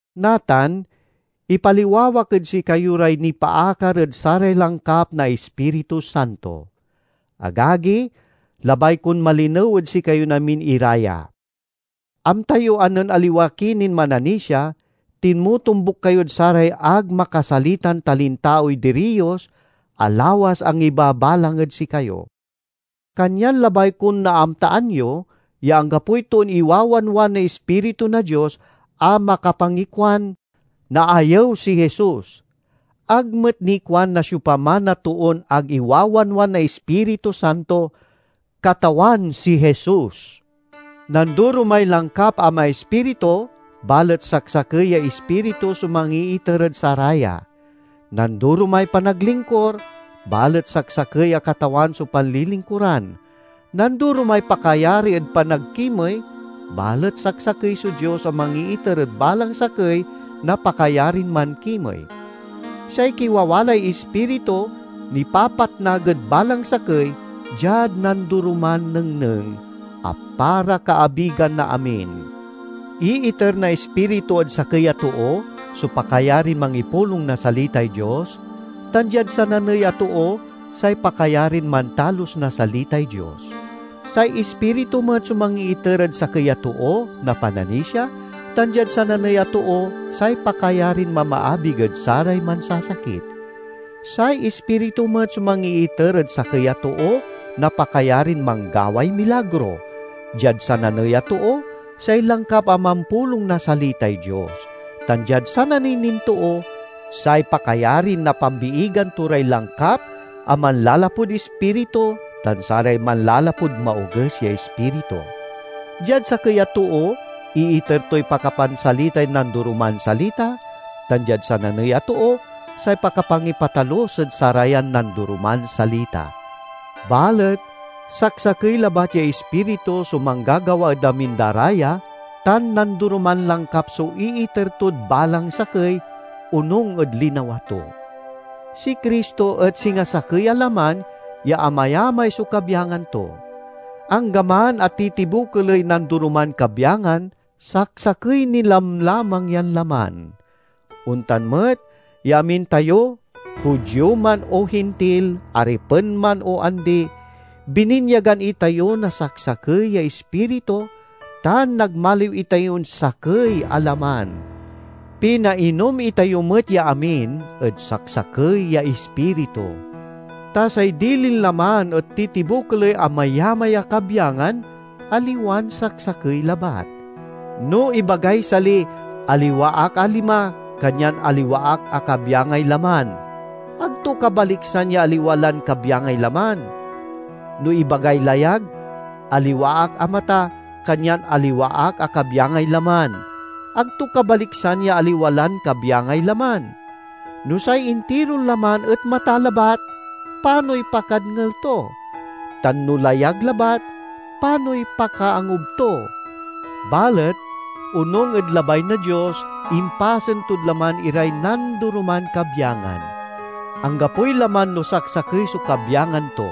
Natan, ipaliwawak ed sikayo ray nipaakar ed saray langkap na Ispiritu Santo. Agagi, labay kon malinew ed sikayon amin ira ya. Amta yo a nen aliwa ki nin mananisia, tinmotombuk kayod saray ag makasalitan talintaoy diriyos a lawas angibabalang ed sikayo. Kanyan labay kon naamtaan yo ya anggapoy toon iwawanwan na Ispiritu na Dios a makapangikuan, "Naayew si Jesus!" Ag met nikuan na siopaman a toon ag iwawanwan na Ispiritu Santo, "Katawan si Jesus." Nandoromay langkap a maispiritu, balet saksakey ya Ispritu so mangiiter ed saraya. Nandoromay panaglingkur, balet saksakey a Katawan so panlilingkuran. Nandoromay pakayari ed panagkimey, balet saksakey so Dios a mangiiter ed balang sakey na pakayarin mankimey. Say kiwawalay Ispiritu nipapatnag ed balang sakey diad nandoroman nengneng, a para kaabigan na amin. Iiter na Ispiritu ed sakey a too so pakayarin mangipulong na salitay Dios, tan diad sananey a too say pakayarin mantalus na salitay Dios. Say Ispiritu met so mangiiter ed sakey a too na pananisia, tan diad sananey a too say pakayarin mamaabig ed saray mansasakit. Say Ispiritu met so mangiiter ed sakey a too na pakayarin manggaway milagro; diad sananey a too, say langkap a mampulong na salitay Dios; tan diad sananey nin too, say pakayarin napambiigan to ray langkap a manlalapud Ispiritu tan saray manlalapud maoges ya ispiritu. Diad sakey a too iiter toy pakapansalitay nandoroman salita, tan diad sananey a too say pakapangipatalus ed sarayan nandoroman salita. Balet saksakey labat ya Ispiritu so manggagawa ed amin da ra ya, tan nandoroman langkap so iiter tod balang sakey, onung ed linawa to. Si Cristo et singa sakey a laman ya amayamay so kabyangan to; anggaman a titibokeley nandoroman kabyangan, saksakey ni lamlamang yan laman. Ontan met ya amin tayo, Judio man o Hintil, aripen man o andi, bininyagan itayo na saksakey ya Ispiritu, tan nagmaliw itayon sakey a laman. Pinainom itayo met ya amin ed saksakey ya Ispiritu. Ta say dilin laman et titibokeley amayamay a kabyangan, aliwan saksakey labat. No ibagay sali, "Aliwa ak a lima, kanyan aliwa ak a kabyangay laman," ag to kabaliksan ya aliwa lan kabyangay laman. No ibagay layag, "Aliwa ak a mata, kanyan aliwa ak a kabyangay laman," ag to kabaliksan ya aliwa lan kabyangay laman. No say intiron laman et mata labat, panoy pakadngel to? Tan no layag labat, panoy pakaangub to? Balet, onung ed labay na Dios, impasen tod laman iray nandoroman kabyangan. Anggapoy laman no saksakey so kabyangan to!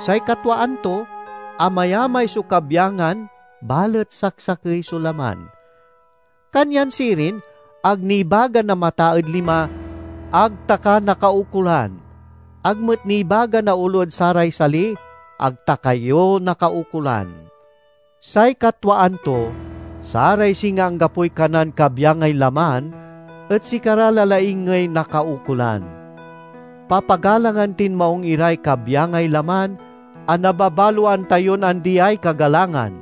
Say katwaan to, amayamay so kabyangan balet saksakey so laman. Kanyan sirin, ag nibaga na mata ed lima, "Ag ta ka nakaukolan!" Ag met nibaga na olo ed saray sali, "Ag ta kayo nakaukolan." Say katwaan to, saray singa anggapoy kanan kabyangay laman et sikara la laingey nakaukolan. Papagalangan tin maung iray kabyangay laman a nababaloan tayon andiay kagalangan.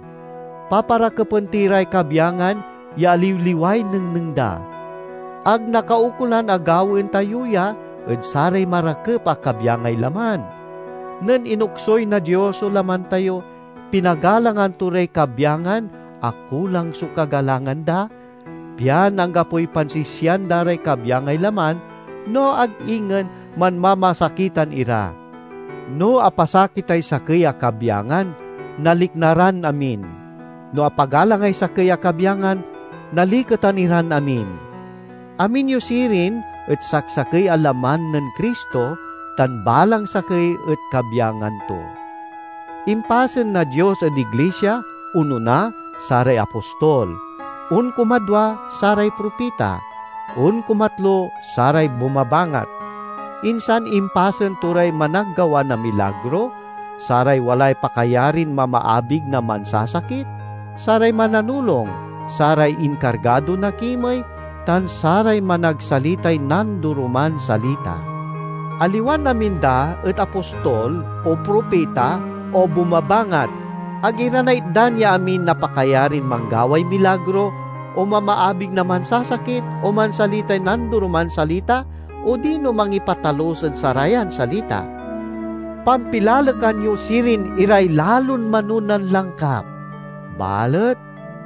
Paparakepen ti ray kabyangan ya aliwliway nengneng da. Ag nakaukolan a gawaen tayo ya ed saray marakep a kabyangay laman. Nen inoksuy na Dios so laman tayo, pinagalangan to ray kabyangan a kulang so kagalangan da, pian anggapoy pansisian da ray kabyangay laman, no ag ingen manmamasakitan ira. No apasakitay sakey a kabyangan, nalikna ran amin. No apagalangay sakey a kabyangan, naliketan iran amin. Amin yo sirin et saksakey a laman nen Cristo, tan balang sakey et kabyangan to. Impasen na Dios ed iglisia, onona, saray apostol; onkumadwa, saray propita; onkumatlo, saray bumabangat. Insan impasen to ray managgawa na milagro, saray walay pakayarin mamaabig na mansasakit, saray mananulong, saray inkargado na kimey, tan saray managsalitay nandoroman salita. Aliwan amin da et apostol, o propita, o bumabangat. Ag ira naitdan ya amin na pakayarin manggaway milagro, o mamaabig na mansasakit, o mansalitay nandoroman salita, odino mangipatalus ed sarayan salita. Pampilalekan yo sirin iray lalon manonan langkap. Balet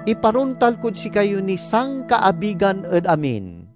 iparontal kod sikayo niy sankaabigan ed amin.